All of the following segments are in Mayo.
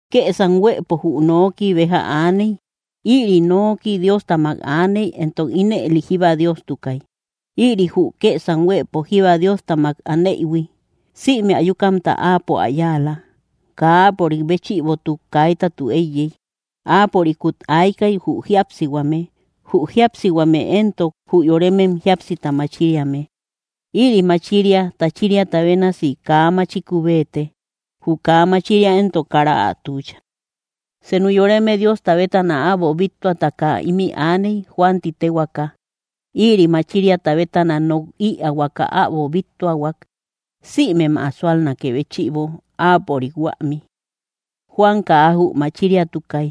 Kësam huëpo jü Noki béja aaney. Ïri Noki Diostamak aaney, éntok ínëli jíba Diostukay. Ïri jü kësam huëpo jíba Diostamak aneïhui. Sïme ayukamta áapo ä yáala. Kaa áapörik béchïbotuk kaitatu éiyey. Áapörikut aykay, jü jíapsihuame. Jü jíapsihuame éntok, jü yoremem jíapsita machiriame. Ïri machiria tachiriata bénasi kaa machiku béete; jü kaa machiria éntok kara ä tuucha. Senu yoreme Diosta bétana äbo bíttuataka ímï aaney, Juan ti téhuaaka. Ïri machiriata bétana nok ïaahuaka äbo bíttuahuak, sïmem ä súalnakë béchïbo, áapörik huämi. Juan kaa jü machiriatukay;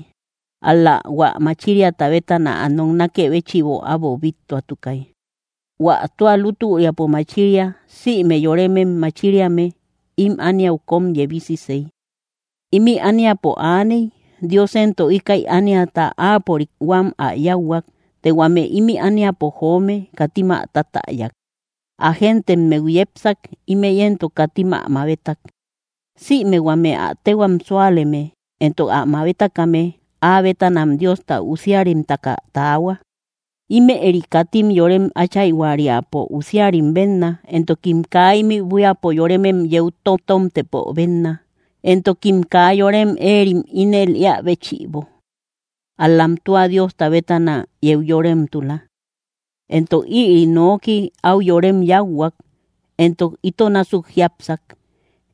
ál‑la hua machiriata bétana ä noknakë béchïbo äbo bíttuatukay. Huä tua lútüriapo machiria, sïme yoremem machiriame, ím ániau kóm yebisisey. Ímï ániapo aaney; Dios éntok íkäi ániata áapörik huam ä yáuhuak. Të huame ímï ániapo joome, katim ä tatäyak. Ä géntemmeu yepsak; ímëi éntok, katim ä mabetak. Sïme huame ä téhuam súaleme, éntok ä mabetakame, áa bétanam Diosta usiarimtaka taahua. Ímëri katim yorem áchayhuariapo usiarim bénna, éntokim kaa ímï buíapo yoremem yeu totomtëpo bénna, éntokim kaa yorem éerim ínel éä béchïbo. Ál‑lam tua Diosta bétana yeu yoremtula. Entok iri Noki áu yorem yáuhuak, éntok ito násuk jiápsak.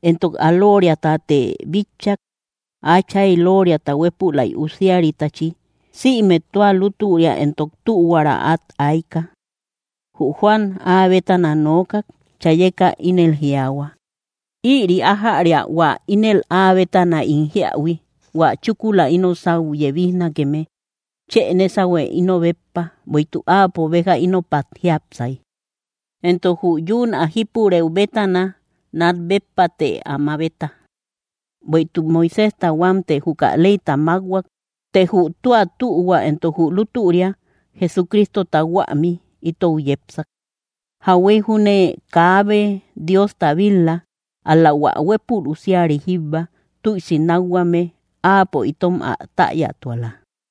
Éntok ä loriatate bitchak, Áchayta looria huépülay Usiaritachi. Sïme tua lútüria éntok tühuara át ayka. Jü Juan áa bétana nookak. Chayeka ínel jiaahua: —Ïri ájäria hua ínel áa bétana ín jíähui: Huä chúkula ino sáu yebijnakeme, chë nésahue ino béppa, bueïtuk áapo béja ínopat jiápsay. Éntok jü yún ä jípurëu bétana, nat béppate ä mabeta. Bueïtuk Moiséjta huámte juka leyta mákhuak, të jü tua tühua éntok jü lútüria Jesucristota huämi, itou yepsak. Jauhuey júne kaabe Diosta bil-la; ál‑la hua huépul Usiari jíbba, tüisi nákhuame, áapo itom ä täyatuala.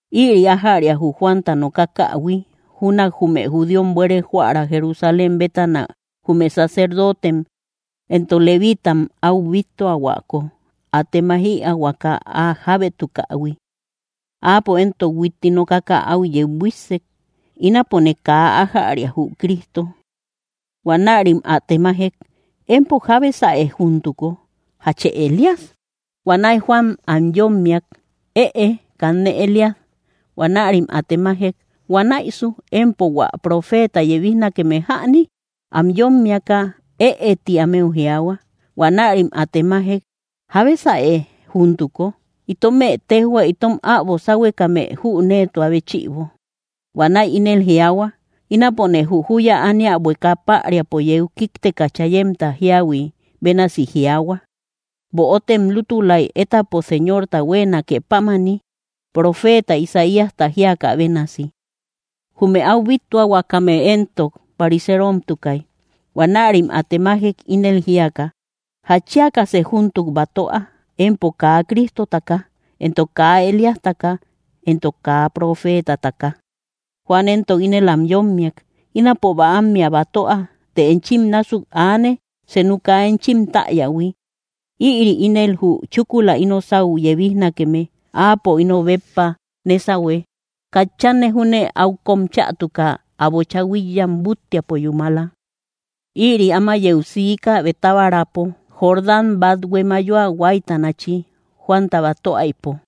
Ïri ájäria jü Juanta nokakähui, júnak jume judíom buere joära Jerusalén bétana jume sacerdotem, éntok leviitam áu bíttuahuako, ä temaij‑ïaahuaka ä jábétukaïhui. Áapo éntok huitti nokaka, áu yeu buíssek: —Ínapone kaa ájäria jü Cristo. Huanärim ä temajek: —Empo, ¿jábesäe júntuko? ¿Jachë Elías? Huanäi Juan am yómmiak: —Ëe, kanne Elías. Huanärim ä temajek: —¿Huanäisu empo hua profeeta yebijnakeme jäni? Am yómmiaka: —Ëe, ti ámeu jiaahua. Huanärim ä temajek: —¿Jábesäe júntuko? Itomë téjhua itom äbo sáhuekame jüneetua béchïbo. Huanäi ínel jiaahua: —Ínapone jü júya ánia bueka päriapo yeu kíkteka chayemta jíahui bénasi jiaahua: “Böotem lútulaik étapo Señorta huéenake pámani” —profeeta Isaíasta jíakä bénasi. Jume áu bíttuahuakame éntok, pariseromtukay. Huanärim ä temajek, ínel jíaka: —¿Jatchiakasë júntuk batöa, empo kaa Cristotaka, éntok kaa Elíastaka, éntok kaa profeetataka? Juan éntok ínel am yómmiak: —Ínapo bäammea batöa; të enchim násuk aane, senu kaa enchim täyähui. Ïri ínel jü chúkula ino sáu yebijnakeme. Áapo ino béppa nésahue; katchanne júne áu kóm chätuka, ä bocha huíkyam búttiapo yúmala. Ïri áma yeu siika Betábarapo, Jordán bathue mayoa huáitanachi, Juanta batöaïpo.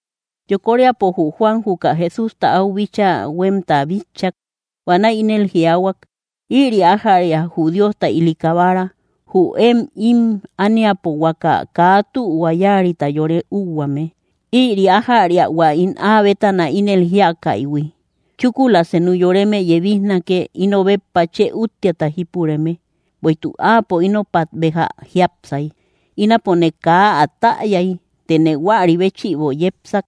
Yokoríapo jü Juan juka Jesústa áu bíchaa huémta bitchak. Huanäi ínel jiaahuak: —Ïri, ájäria jü Diosta ili Kabara, jü én ím ániapo huaka kaa tühua yáarita yore úhuaame. Ïri ájäria hua ín áa bétana ínel jíakaïhui: “Chúkula senu yoreme yebijnake, ino béppa chë úttiata jípureme; bueïtuk áapo ínopat béja jiápsay.” Ínapone kaa ä täyay; tëne huäri béchïbo yepsak,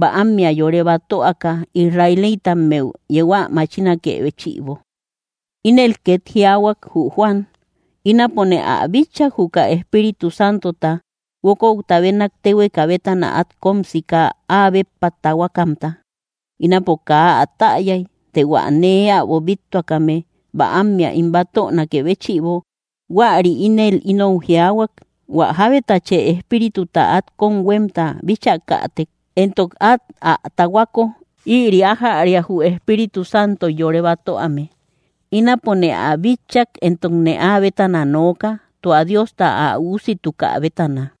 bäammea yore batöaka Israelitammeu yeu ä machinakë béchïbo. Ínel két jiaahuak, jü Juan: —Ínapone ä bitchak, juka Espíritu Santota guókouta bénak téhueka bétana át kóm sika áa béppa tahuakamta. Ínapo kaa ä täyay; të hua nee äbo bíttuakame bäammea ín batönakë béchïbo, huäri ínel inou jiaahuak: “Huä jábetachë Espírituta át kóm huémta bíchakätek, éntok át ä tahuako, ïri ájäria jü Espíritu Santoy yore batöame.” Ínapone ä bitchak, éntokne áa bétana nooka, tua Diosta ä Üusitukä bétana.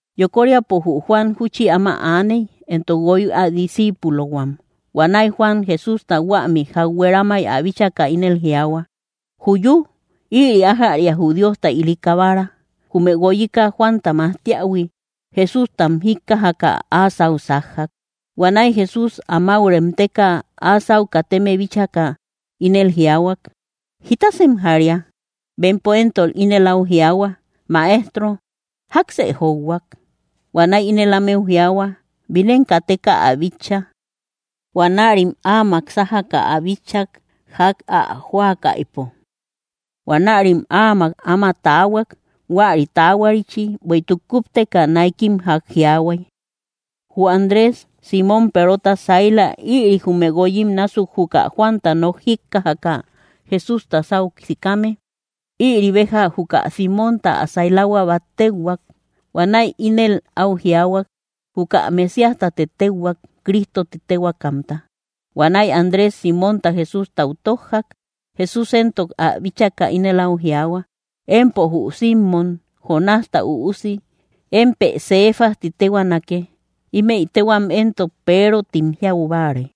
Yokoríapo jü Juan júchi áma aaney, éntok guoy ä disciipulohuam. Huanäi Juan, Jesústa huämi ják hueramay ä bíchaka, ínel jiaahua: —¡Juyú! ¡Ïri ájäria jü Diosta ili Kabara! Jume guoyika Juanta majtiähui, Jesústam jíkkajaka, áa sáu sájjak. Huanäi Jesús amáu remteka áa sáu kateme bíchaka, ínel jiaahuak: —¿Jítasem jaria? Bempo éntok ínel áu jiaahua: —Maestro, ¿jáksë jóuhuak? Huanäi ínel ámeu jiaahua: —Bínem kateka ä bitcha. Huanärim áamak sájaka ä bitchak, ják ä jóakaïpo. Huanärim áamak áma taahuak, huäri taahuarichi; bueïtuk kúpteka náikim ják jiaahuay. Jü Andrés, Símon Perota saila, ïri jume guoyim násuk juka Juanta nok jíkkajaka Jesústa sáu sikame. Ïri béja juka Símonta ä sailahua bát téuhuak. Huanäi ínel áu jiaahuak: —Juka Mesíastate téuhuak —Cristo ti téhuaakamta. Huanäi Andrés Símonta Jesústau tójjak. Jesús éntok ä bíchaka ínel áu jiaahua: —Empo jü Simmom, Jonásta üusi; émpë Cefas ti téhuaanake. (Ímëi téhuam éntok Peero tim jiau báare.)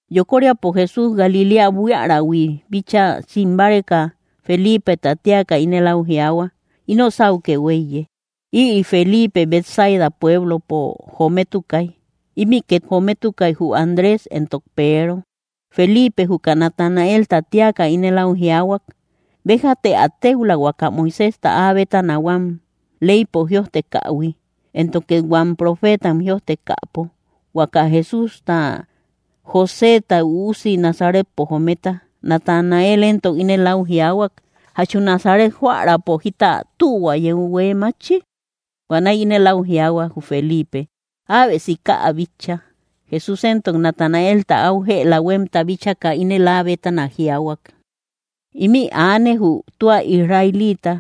Yokoríapo Jesús Galiléa buiarähui bíchaa sim báreka, Felipeta téaka ínel áu jiaahua: —Ino sáukë huéiye. Ïri Feliipe Betsaida pueblopo jometukay. Ímï két jometukay jü Andrés éntok Peero. Feliipe juka Natanaelta téaka ínel áu jiaahuak: —Béjate ä téula huaka Moiséjta áa bétana huam leypo jïojtekähui, éntok két huam profeetam jïojtekäpo, huaka Jesústa, Joséta üusi, Nazaretpo jometa. Natanael éntok ínel áu jiaahua: —¿Jachu Nazaret joärapo jita tühua yeu huée mátchi? Huanäi ínel áu jiaahua jü Feliipe: —Äbe sika ä bitcha. Jesús éntok Natanaelta áu jëla huémta bíchaka, ínel áa bétana jiaahuak: —Ímï aane, jü tua israelita;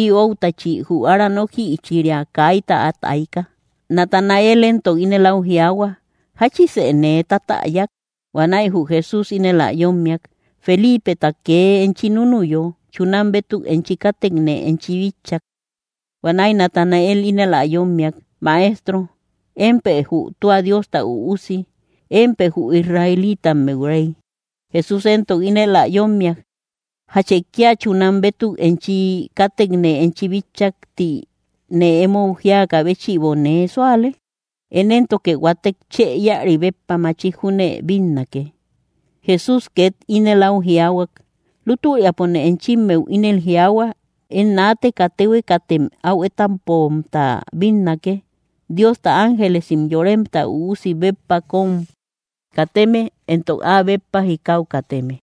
ï óutachi jü ára nókïchiria kaita át ayka. Natanael éntok ínel áu jiaahua: —¿Jáchisë nee tatäyak? Huanäi jü Jesús ínel ä yómmiak: —Felipeta kee enchi núnuyo, chunam bétuk enchi kátekne enchi bitchak. Huanäi Natanael ínel ä yómmiak: —Maestro, ¡émpë jü tua Diosta Üusi! ¡Émpë jü israelitammeu Rey! Jesús éntok ínel ä yómmiak: —¿Jachë kíal chunam bétuk enchi kátekne enchi bitchak ti nee emou jíakä béchïbo nee súale? Én éntoke huatek chë íäri béppa machik junne bínnake. Jesús két ínel au jiaahuak: —Lútüriapone enchimmeu ínel jiaahua: Én naateka téhuekatem áu étapomta bínnake, Diosta ángelesim Yoremta Üusi béppa kóm kateme, éntok áa béppa jikau kateme.